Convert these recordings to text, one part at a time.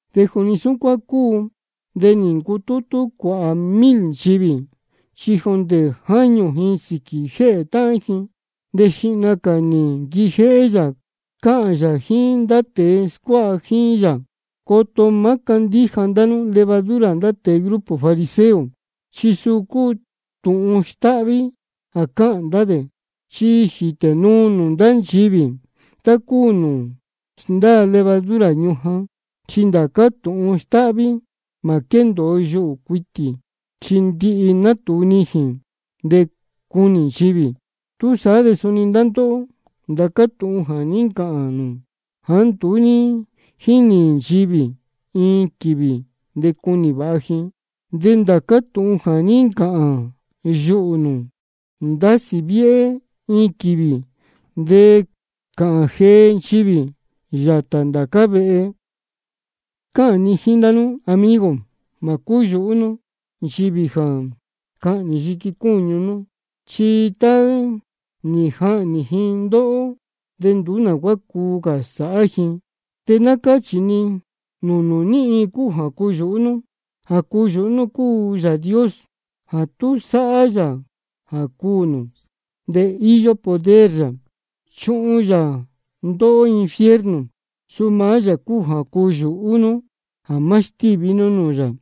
De juni súcuán cúu, de nī ncutútú cuāhā mil nchivī, chi jondē jáñū ji sīquī jéhē táhán ji. De xihna cā nī nquijéhé yā cáhān yā jíín ndá tēe scuáha jíín yā: Coto má cándíja ndá nú levadura ndá tēe grupo fariseo, chi suu cúu tūhun stáhví jā cáhān ndá dē. Chi jítē nuu nūū ndá nchivī tá cúu nūū sndáa levadura ñujan. Chi ndācá tūhun stáhví mā quéndōo yuhū cuitī, chi ndihi natūu nijīn de cunī nchivī. Túsaá de suni ndá ndóhó, ndācá tūhun jā ní ncāhān nū jāá nduú ní jínī nchivī, iin quīvī de cunī vāha ji. De ndācá tūhun jā ní ncāhān yuhū nū jā ndásī viéhé, iin quīvī de cāhān jee nchivī yātā ndācá vehe. Cáhān ni jíín ndá nú, amigo: Mā cúyūhú nú nchivī jā cahnī yiqui cúñu nú, chi tá nī jahnī ji ndóhó, de nduú nā cuá cuu cā sāhá ji. De ná cáchī ni nūū nū ní iin cúu jā cuyūhú nú: Jā cuyūhú nú cúu Yāā Dios jā tú sáhá yā jā cuū nū, de íyó poder yā jā chuhun yā ndóhó infierno. Suu maá yā cúu jā cuyūhú nú jā má stíví nú nūū yā.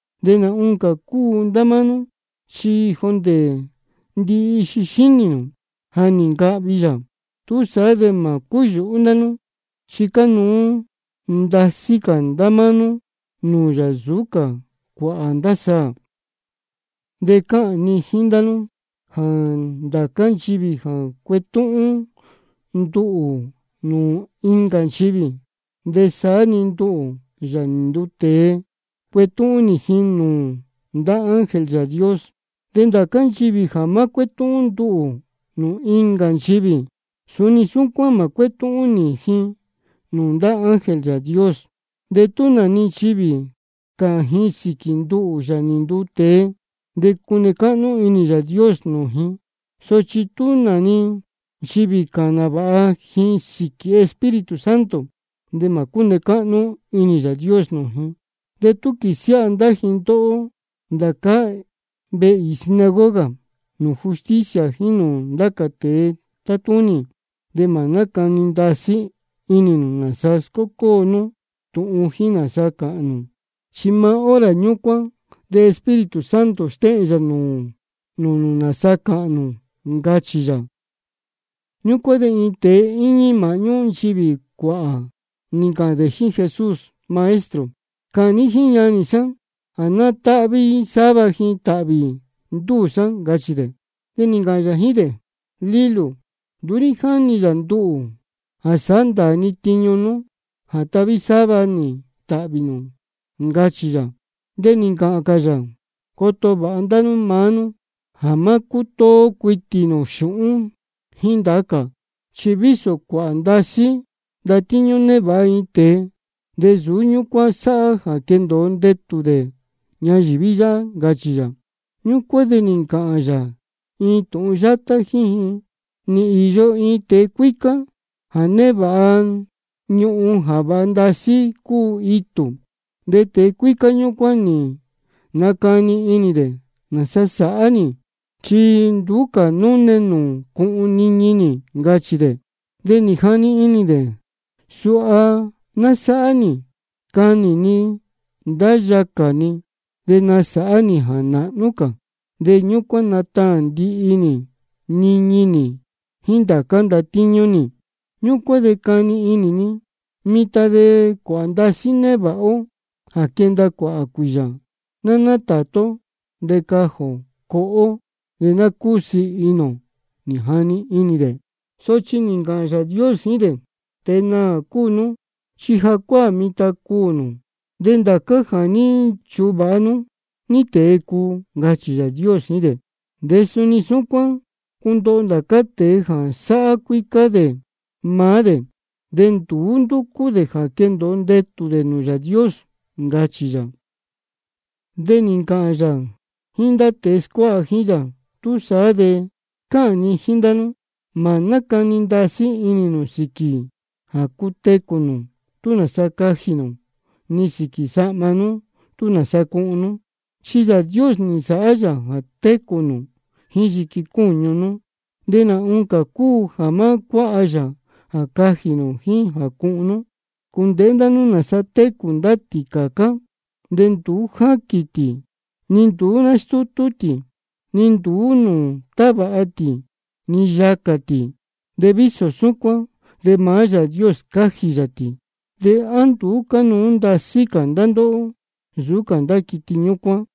De nā oncā cúu ndá máá nú, chi jondē ndihi ixi xínī nū ja nī ncahvi yā. Túsaá de mā cúyūhú ndá nú, chi cánuú ndasí cā ndá máá nú nūū yā nsūú cā cuāhā ndá saā. De cáhān ni jíín ndá nú jā ndācá nchivī jā cuetúhún nduhū nūū incā nchivī, de saá-ni nduhū, Yāā nī nduu tēe, cuetúhún nī ji nūū ndá ángel Yāā Dios. De ndācá nchivī jā má cuétúhún nduhū nūū incā nchivī, suni súcuán mā cuétúhún nī ji nūū ndá ángel Yāā Dios. De tú nā-ni nchivī cāhān ji sīquī nduhū, Yāā nī nduu tēe, de cune cáhnú inī Yāā Dios nūū ji. Sochi tú nā-ni nchivī cāhān nāvāha ji sīquī Espíritu Santo, de mā cúne cáhnú inī Yāā Dios nūū ji. De tú quīsiáha ndá ji ndóhó ndācá vehe īī sinagoga nūū justicia jíín nūū ndá cā tēe tátúnī, de mā nácani ndasí inī nū nāsa scócóo nú tūhun jíín nāsa cāhān nū. Chi maá hora ñúcuán de Espíritu Santo stéhēn yā nūū nū nāsa cāhān nū, ncachī yā. Ñúcuán de iin tēe íñí māhñú nchivī cuāhā, nī ncāhān dē jíín Jesús: Maestro, cāhān ní jíín ñanī sá jā ná táhví sáva dē tāhvī ndúū sá, ncachī dē. De nī ncāhān yā jíín dē: Lílū, nduú ní jáni yā nduhū jā sāhá ndāā ni tiñu nú jā tahví sáva nī tāhvī nū, ncachī yā. De nī ncāhān cā yā: Coto vāha ndá nú maá nú jā má cútóó cuitī nū xūhún jíín ndá cā. Chi vísō cuāhā ndasí ndatíñú névāha iin tēe, de nsūú ñúcuán sāhá jā quendōo ndetū dē ñayīví yáhá, ncachī yā. Ñúcuán de nī ncāhān yā iin tūhun yátá jíín ji: Nī īyo iin tēe cuícá jā névāha ñuhun jā vāha ndasí cúu itū. De tēe cuícá ñúcuán nī nacani inī dē: ¿Nāsa sāhá nī? Chi nduú cā núne nūū cuhun niñi nī. Ncachī dē. De nī jani inī dē: Suha ná sáhá nī: Canī ni ndá yacā ni, de nasāhá nī jā nāhnú cā. De ñúcuán nataān ndihi nī niñi nī jíín ndācá ndatíñú nī. Ñúcuán de cani inī ni: Mitan de cuāhā ndasí névāha ó jā quenda cuāhā cuīyā. Ná nátātú ó, de cajī ō coho ó, de ná cúsiī inī ō, nī jani inī dē. Sochi nī ncāhān Yāā Dios jíín dē: Tēe naā cúu nú, chi jacuáā mitan de cuū nū, de ndācá jā ní nchuvāha nú, ¿ní tēe cuu? Ncachī Yāā Dios jíín dē. De suni súcuán cundoho ndācá tēe jā sáhá cuícá dē maá dē, de nduú ndúcú dē jā quendōo ndetū dē nūū Yāā Dios, ncachī yā. De nī ncāhān yā jíín ndá tēe scuáha jíín yā: Túsaá de cáhān ni jíín ndá nú: Mā nácani ndasí inī nū sīquī jā cutecū nū, tú nāsa cajī nū, ni sīquī sahma nú, tú nāsa cuhun nú. Chi Yāā Dios nī nsāhá yā jā técū nū jíín yiqui cúñu nú, de nā oncā cúu jā má cuáha yā jā cajī nū jíín jā cuhun nú. Cūndēhé ndá nú nāsa técū ndá tīcācá, de nduú jáquīn tī, ni nduú nástútú tī, ni nduú nūū tavāha tī ni yacā tī. De vísō súcuán de maá Yāā Dios scájī yā tī. ¿De á nduú cánuú ndasí cā ndá ndóhó nsūú cā ndá quiti ñúcuán?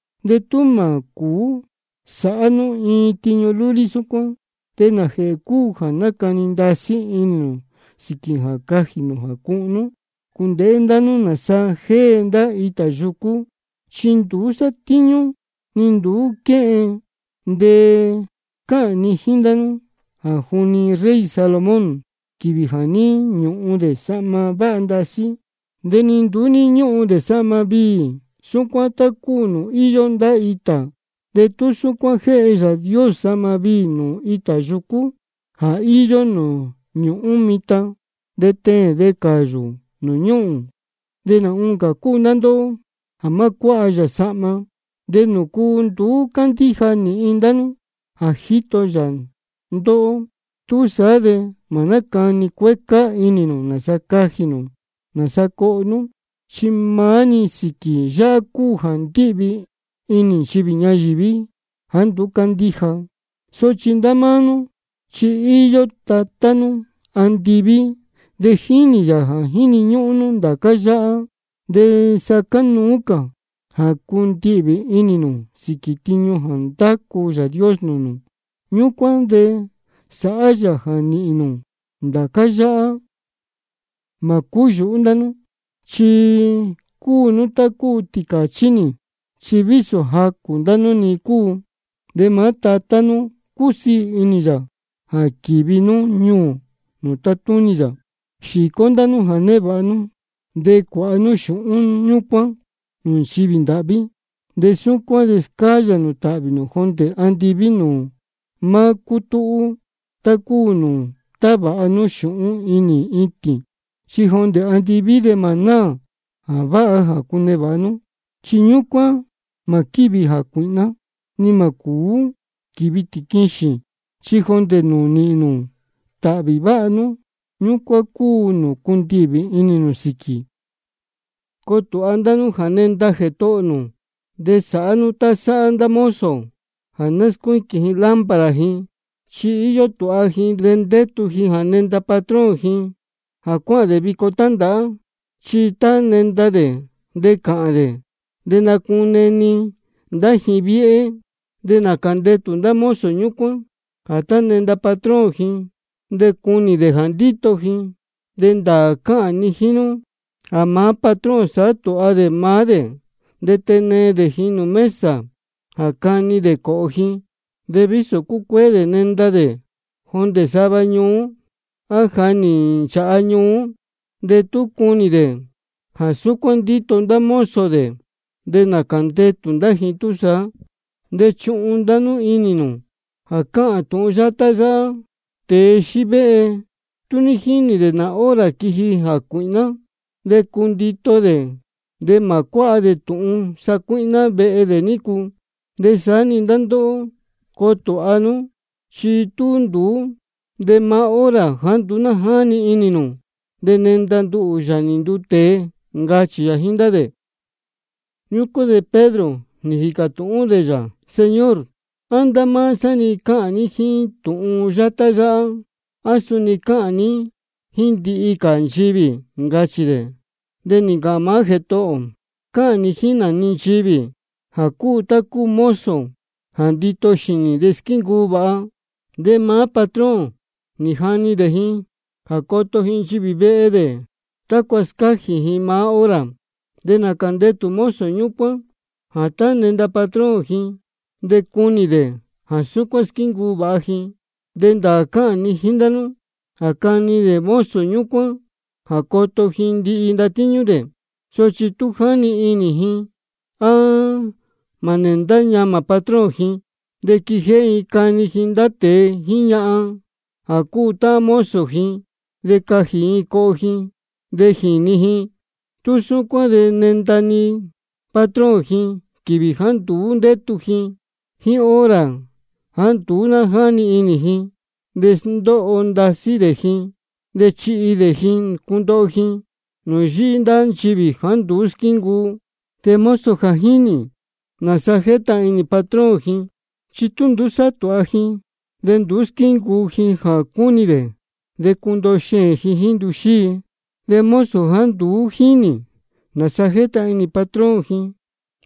De tú mā cūú sāhá nú iin tiñu lúlí súcuán, ¿de nājēhē cúu jā nácani ndasí inī nū sīquī jā cajī nū jā cuhun nú? Cūndēhé ndá nú nāsa jée ndá itā yucú. Chi nduú sátíñú ni nduú quéhen. De cáhān ni jíín ndá nú jā juni rey Salomón, quīvī jā ní ñúhun dē sahma váha ndasí, de ni nduú ní ñúhun dē sahma viī súcuán tá cúu nūū íyó ndá itā. De tú súcuán jéhe Yāā Dios sahma viī nūū itā yucú jā íyó nūū ñūhún mitan de teēn de cāyū nūū ñúhūn, de nā oncā cúu ndá ndóhó jā má cuáha yā sahma. ¿De nūcu nduú cándíja nīhin ndá nú jā jíto yā ndóhó? Túsaá de mā nácani cuécá inī nū nāsa cajī nū nāsa coho nú. Chi maá-ni sīquī yáhá cúu jā ndíhvī inī nchivī ñayīví jāá nduú cándíja. Sochi ndá máá nú chi íyó Tatá nú andiví, de jínī yā jā jíni ñúhún nú ndācá yáhá. De sa cánuú cā jā cundihvī inī nū sīquī tiñu jā ndácu Yāā Dios nūū nū. Ñúcuán de sāhá yā jā nīhīn nū ndācá yáhá. Mā cúyūhú ndá nú chi cúu nú tá cúu tīcāchí nī. Chi vísō jacū ndá nú-ni cúu, de maá Tatá nú cúsiī inī yā jā quīvi nú ñuū nūū tátúnī yā. Xīcó ndá nú jā névāha nú, de cuāha nú xūhún ñúcuán nūū nchivī ndāhví. De súcuán de scáyā nū tāhvī nū jondē andiví nūū má cútúhú, tá cúu nūū távāha nú xūhún inī itīn. Chi jondē andiví de mā náā jā váha jā cunevāha nú. Chi ñúcuán mā quívi jācuīhná, ni mā cūú stíví tīquixīn. Chi jondē nūū nīhīn nū tāhvī váha nú, ñúcuán cúu nūū cundihvī inī nū sīquī. Coo tūha ndá nú jā nenda Jētohō nū, de sāhá nú tá sáhá ndá mozo jā náscuíquīn ji lámpara ji. Chi íyó tūha ji de ndétu ji jā nenda patrón ji jā cuáhān dē vico tándāhá. Chi tá nenda dē de cāhān dē, de nacune-ni ndá ji viéhé. De nācā ndetū ndá mozo ñúcuán jā tá nenda patrón ji, de cunī dē jā ndíto ji. De ndāā cáhān ni jíín nú jā maá patrón sāhá tūha dē maá dē, de tenee dē ji nūū mesa jā cani dē cōhō ji. De vísō cucuéé dē nenda dē jondē sava ñuú, á ja nī nchāha ñuú, de tú cunī dē jā súcuán ndíto ndá mozo dē, de nācā ndetū ndá ji túsaá. De chuhun inī ndá nú jā cáhān tūhun yátá yáhá: Tēe xívéhe, tú ní jínī dē nā hora quiji jācuīhná, de cundito dē, de mā cuáha dē tūhun sacuíhná vehe dē nícu. De saá-ni ndá ndóhó, coo tūha nú, chi tú nduú, de maá hora jāá nduú ná jáni inī nū, de nenda nduhū, Yāā nī nduu tēe, ncachī yā jíín ndá dē. Ñúcuán de Pedro nī jīcā tūhún dē yā: Señor, ¿á jíín ndá máá sá-ni cáhān ní tūhun yátá yáhá, á suni cáhān ní jíín ndihi cā nchivī? ncachī dē. De nī ncāhān maá Jētohō ō: Cáhān ni jíín nā-ni nchivī jā cúu tá cúu mozo jā ndito xīnī de squíncuu vāha. De maá patrón nī jani dē ji jā coto ji nchivī vehe dē, tácua scájī ji maá hora. De nācā ndetū mozo ñúcuán jā tá nenda patrón ji, de cunī dē jā súcuán squíncuu vāha ji. De ndāā cáhān ni jíín ndá nú jā cani dē mozo ñúcuán jā coto ji ndihi ndatíñú dē. Sochi tú jáni inī ji jā má nēndá ñamā patrón ji, de quijéhé ji cani ji ndá tēe jíín ñahan jā cúu táhán mozo ji, de cajī ji coho ji de jīni ji, tú súcuán de nenda-ni patrón ji quīvī jāá nduú ndétu ji jíín hora jāá nduú ná jáni inī ji. De sndóho ndasí dē ji, de chihi dē ji cundoho ji nūū yíhí ndá nchivī jāá nduú squíncuu. De mozo jā jínī nāsa jétahān inī patrón ji, de tú nduú sátūha ji de nduú squíncuu ji jā cúnī dē, de cundoho xēēn ji jíín ntuxíi. De mozo jāá nduú jínī nāsa jétahān inī patrón ji,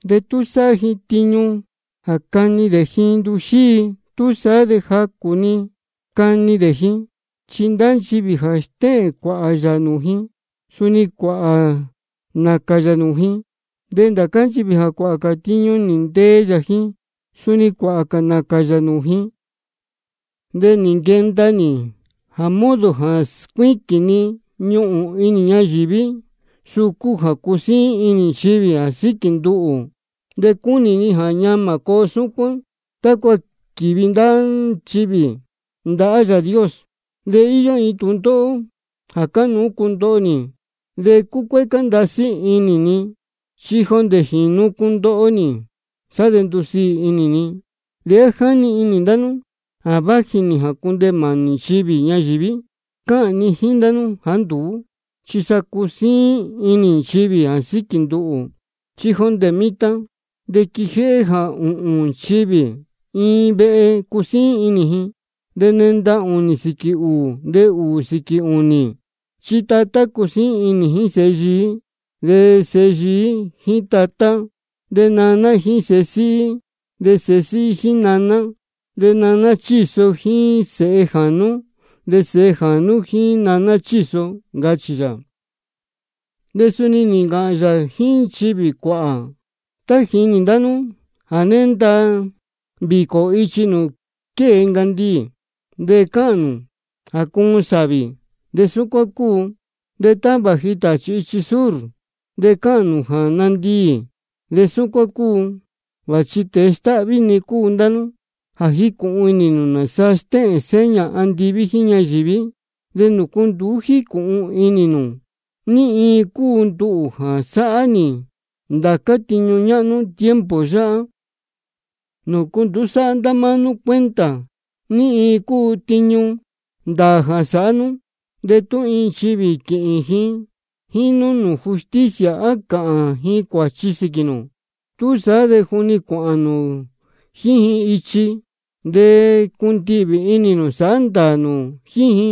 de tú sáhá ji tiñu jā cani dē ji ntuxíi, túsaá de jacū-ni cani dē ji. Chi ndá nchivī jā stéhēn cuāhā yā nūū ji, suni cuāhā nācān yā nūū ji. De ndá nchivī jā cuāhā cā tiñu nī ntee yā ji, suni cuāhā cā nācān yā nūū ji. Nī nquenda nī jā modo jā scuíquīn ni ñuhūn inī ñayīví, de suu cúu jā cusíín inī nchivī jā síquī nduhū. De cúnī ni jā ñamā coo súcuán, tácua quīvi ndá nchivī ndahá Yāā Dios. De íyó iin tūndóhó jā cánuú cundoho nī, de cúcuécá ndasí inī ni chi jondē jīnu cundoho nī, sá de ndusiī inī ni. ¿De á jáni inī ndá nú jā váji nī jā cundeē mānī nchivī ñayīví? Cáhān ni jíín ndá nú jāá nduú, chi sa cusíín inī nchivī jā síquī nduhū. Chi jondē mitan de quijéhé jā ūhūn nchivī iin vehe cusíín inī ji. De nenda ūnī sīquī ūū, de ūū sīquī ūnī. Chi tatá cusíín inī jíín sēhe yií, de sēhe yií jíín tatá, de naná jíín sēhe síhí, de sēhe síhí jíín naná, de naná chíso jíín sēhe jānú, de sēhe jānú jíín naná chíso, ncachī yā. De suni nī ncāhān yā jíín nchivī cuāhā: Tá jínī ndá nú jā nénda vīcō ichi nūū quée ncandiī, de cáhān nū jā cuun sāvī, de súcuán cúu. De tá vāji tāchī ichi sur, de cáhān nū jā nandiī, de súcuán cúu. Vāchi tēe stáhví-ni cúu ndá nú. Ja jícūhun inī nū nāsa stéhēn seña andiví jíín inī ñayīví, ¿de nūcu nduú jícūhun inī nū ní iin cúu nduhū jā sáhá nī ndācá tiñu ñáhnú tiempo yáhá? ¿De nūcu nduú sáhá ndá máá nú cuenta ní iin cúu tiñu ndāā jā sāhá nú? De tú iin nchivī quīhīn ji jíín nú nūū justicia jā cāhān ji cuāchi sīquī nū, túsaá de juni cuāhān nū jíín ji ichi de cundihvī inī nū sāhá ndāā nū jíín ji.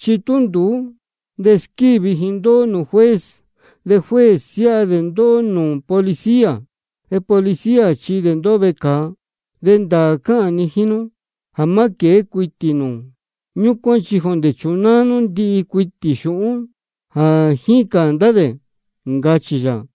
Chi tú nduú, de squívi ji ndóhó nūū juez, de juez siáha dē ndóhó nūū policía, de policía chihi dē ndóhó vecāa. De ndāā cáhān ni jíín nú jā má quēé cuitī nū ñúcuán chi jondē chunáá nú ndihi cuitī xūhún jā jícān ndá dē, ncachī yā.